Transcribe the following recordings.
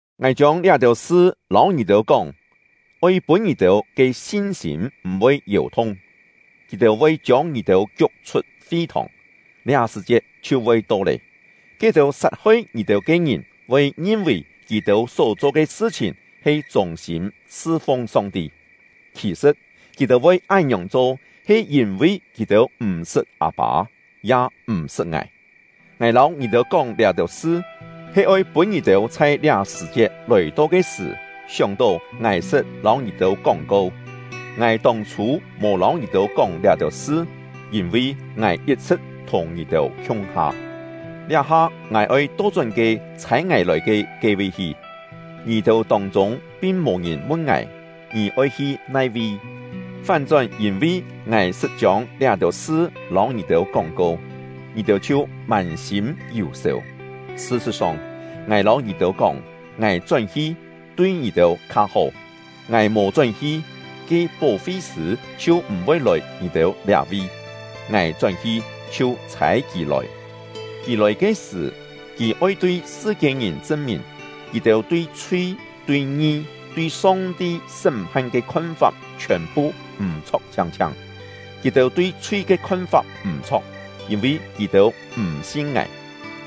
“Ngài chiông liá-têu sṳ lâu ngì-têu kóng, oi pûn ngì-têu ke sin-sîm m̀-voi yèu-thung. Kì-têu voi chiông ngì-têu kiuk-chhut fi-thòng. Liá sṳ̀-chiet chhiu voi to lé, ke-têu sat-hoi ngì-têu ke ngìn voi ngin-vì kì-têu só-cho ke sṳ-chhìn he chûng-sîm sṳ-fung Song-ti. Khì-sṳ̍t, kì-têu voi án-ngiòng cho he yîn-vi kì-têu m̀-sṳt Â-pâ, ya m̀-sṳt ngài. Ngài lâu ngì-têu kóng liá-têu sṳ, he oi pûn ngì-têu chhai liá sṳ̀-chiet lòi-to ke sṳ̀ sióng-tó ngài sṳt lâu ngì-têu kóng-ko. Sṳn-Lìn ke Kûng-chok “Ngài tông-chhû mò lâu ngì-têu kóng liá-têu sṳ, yîn-vi ngài yit-chhṳ̍t thùng ngì-têu khiung-ha. Liá-ha ngài oi to-chón ke ‘Chhâi ngài lòi ke’ ke-vi hi; ngì-têu tông-chûng pin mò-ngìn mun ngài: ‘Ngì oi hi nai-vi?’ Fán-chón yîn-vi ngài sṳt chiông liá-têu sṳ lâu ngì-têu kóng-ko, ngì-têu chhiu mân-sîm yù-sèu. Sṳ-sṳ̍t-song, ngài lâu ngì-têu kóng, ngài chón-hi, tui ngì-têu kha hó; ngài mò chón-hi, ke Pó-fi-sṳ̂ chhiu m̀-voi lòi ngì-têu liá-vi; ngài chón-hi, chhiu chhâi Kì lòi. Kì lòi ke sṳ̀, Kì oi tui sṳ-kiên-ngìn chṳn-mìn: Kì-têu tui chhui, tui ngi, tui Song-ti sṳ́m-phan ke khon-fap chhiòn-phu m̀-chho̍k chhiang-chhiang. Kì-têu tui chhui ke khon-fap m̀-chho̍k, yîn-vi kì-têu m̀ sin ngài;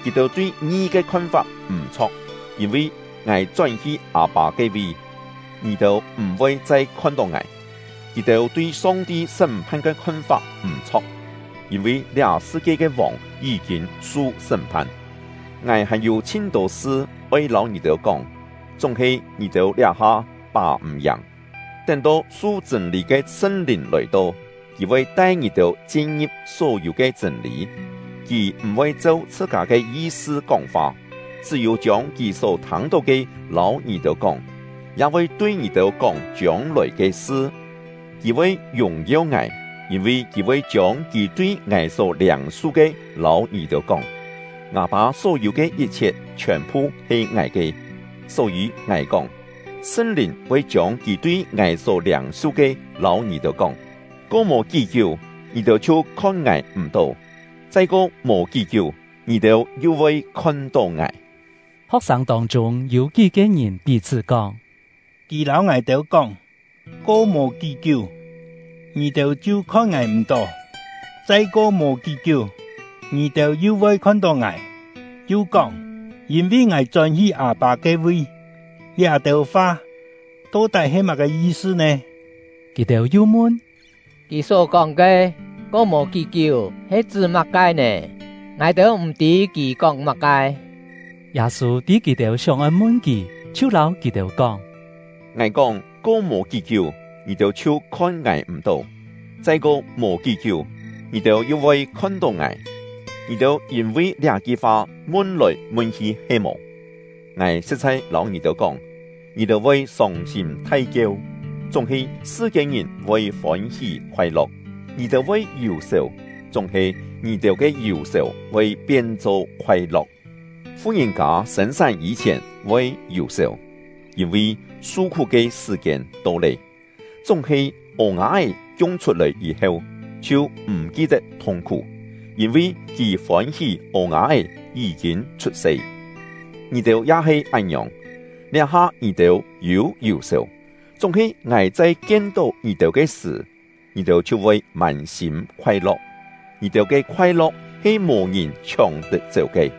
kì-têu tui ngi ke khon-fap m̀-chho̍k, yîn-vi ngài chón-hi Â-pâ ke-vi, ngì-têu m̀-voi chai khon-tó ngài; kì-têu tui Song-ti sṳ́m-phan ke khon-fap m̀-chho̍k, yîn-vi liá sṳ-kie ke vòng yí-kîn su sṳ́m-phan. “Ngài hàn-yû chhin-tô sṳ oi lâu ngì-têu kóng, chúng-he ngì-têu liá-ha pà-m̀-yàng. Tén-to su chṳ̂n-lî ke Sṳn-Lìn lòi-to, Kì voi tai ngì-têu chin-ngi̍p só-yû ke chṳ̂n-lî. Kì m̀-voi cheu chhṳ-kâ ke yi-sṳ kóng-fa, chṳ́-yû chiông Kì só thâng-tó ke lâu ngì-têu kóng, ya voi tui ngì-têu kóng chiông-lòi ke sṳ. Kì voi yùng-yeu ngài, yîn-vi Kì voi chiông Kì tui ngài só liâng-su ke lâu ngì-têu kóng. Ngâ Pâ só-yû ke yit-chhiet chhiòn-phu he ngài ke; só-yî ngài kóng, Sṳn-Lìn voi chiông Kì tui ngài só liâng-su ke lâu ngì-têu kóng. “Ko mò kí-kiú, ngì-têu chhiu khon ngài m̀-tó; chai ko mò kí-kiú, ngì-têu yu voi khon-tó ngài.” Ho̍k-sâng tông-chûng yû kí-ke ngìn pí-chhṳ́ kóng: “Kì lâu ngài-têu kóng ‘Ko mò kí-kiú, ngì-têu chhiu khon ngài m̀-tó; chai ko mò kí-kiú, ngì-têu yu voi khon-tó ngài’ yu kóng ‘yîn-vi ngài chón-hi Â-pâ ke-vi’; liá-têu fa to-tái he má-ke yi-sṳ nè?” Kì-têu yu mun: “Kì só kóng ke ‘Ko mò kí-kiú’ he chṳ́ má-ke nè? Ngài-têu m̀-tî kì kóng má-ke!” Yâ-sû tî kì-têu sióng-oi mun kì, chhiu lâu kì-têu kóng: “Ngài kóng ‘Ko mò kí-kiú, ngì-têu chhiu khon ngài m̀-tó; chai ko mò kí-kiú, ngì-têu yu voi khon-tó ngài’; ngì-têu yîn-vi liá-ki fa mun-lòi mun-hi he-mò? Ngài sṳ̍t-chhai lâu ngì-têu kóng, ngì-têu voi sông-sîm thai-kieu, chúng-he sṳ-kiên-ngìn voi fôn-hí khoai-lo̍k; ngì-têu voi yù-sèu, chúng-he ngì-têu ke yù-sèu voi pien-cho khoai-lo̍k. Fu-ngìn-kâ sên-sán yî-chhièn voi yù-sèu, yîn-vi su-khú ke sṳ̀-kiên to lé; chúng-he ô-nga-é kiung-chhut-lòi yî-heu, chhiu m̀ ki-tet thung-khú, yîn-vi kì fôn-hí ô-nga-é yí-kîn chhut-se. Ngì-têu ya he án-ngiòng: Liá-ha ngì-têu yû yù-sèu, chúng-he ngài chai kien-tó ngì-têu ke sṳ̀, ngì-têu chhiu voi mân-sîm khoai-lo̍k; ngì-têu ke khoai-lo̍k he mò ngìn chhióng-tet-chéu ke.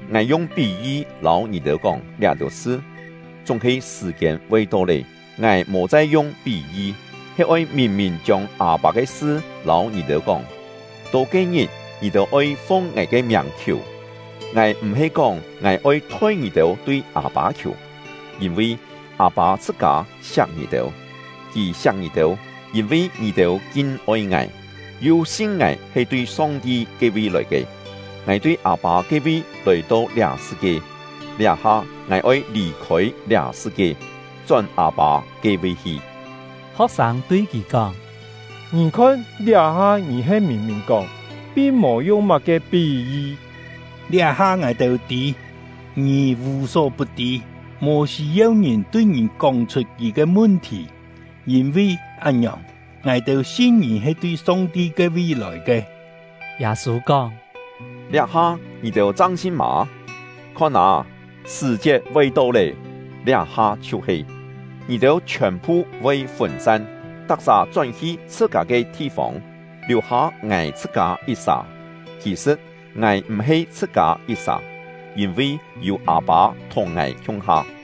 “Ngài yung pí-yi lâu ngì-têu kóng liá-têu sṳ. Chúng-he sṳ̀-kiên voi to lé, ngài mò chai yung pí-yi, he oi mìn-mìn chiông Â-pâ ke sṳ lâu ngì-têu kóng. To ke-ngit, ngì-têu oi fung ngài ke miàng khiù; ngài m̀-he kóng ngài oi thoi ngì-têu tui Â-pâ khiù, yîn-vi Â-pâ chhṳ-kâ siak ngì-têu. Kì siak ngì-têu, yîn-vi ngì-têu kin-oi ngài, yu sin ngài he tui Song-ti “Song-ti”: Yû kú-kién he “Â-pâ”. ke-vi lòi ke. Ngài tui Â-pâ ke-vi lòi-to liá sṳ-kie; liá-ha ngài oi lì-khôi liá sṳ-kie, chón Â-pâ ke-vi hi.” Ho̍k-sâng tui kì kóng: “Ngì khon, liá-ha ngì he mìn-mìn kóng, pin mò yung má-ke pí-yi. Liá-ha ngài-têu tî, ngì vù-só-put-tî, mò sî-yeu ngìn tui ngì kóng-chhut kì ke mun-thì. Yîn-vi án-ngiòng, ngài-têu sin ngì he tui Song-ti ke-vi lòi ke.” Yâ-sû kóng: “Liá-ha ngì-têu chang sin mâ? Khon â, sṳ̀-chiet voi to lé, liá-ha chhiu-he, ngì-têu chhiòn-phu voi fûn-san, tak-sà chón-hi chhṳ-kâ ke thi-fông, liù-hâ ngài chhṳ-kâ yit-sà. Khì-sṳ̍t, ngài m̀-he chhṳ-kâ yit-sà, yîn-vi yû Â-pâ thùng ngài khiung-ha.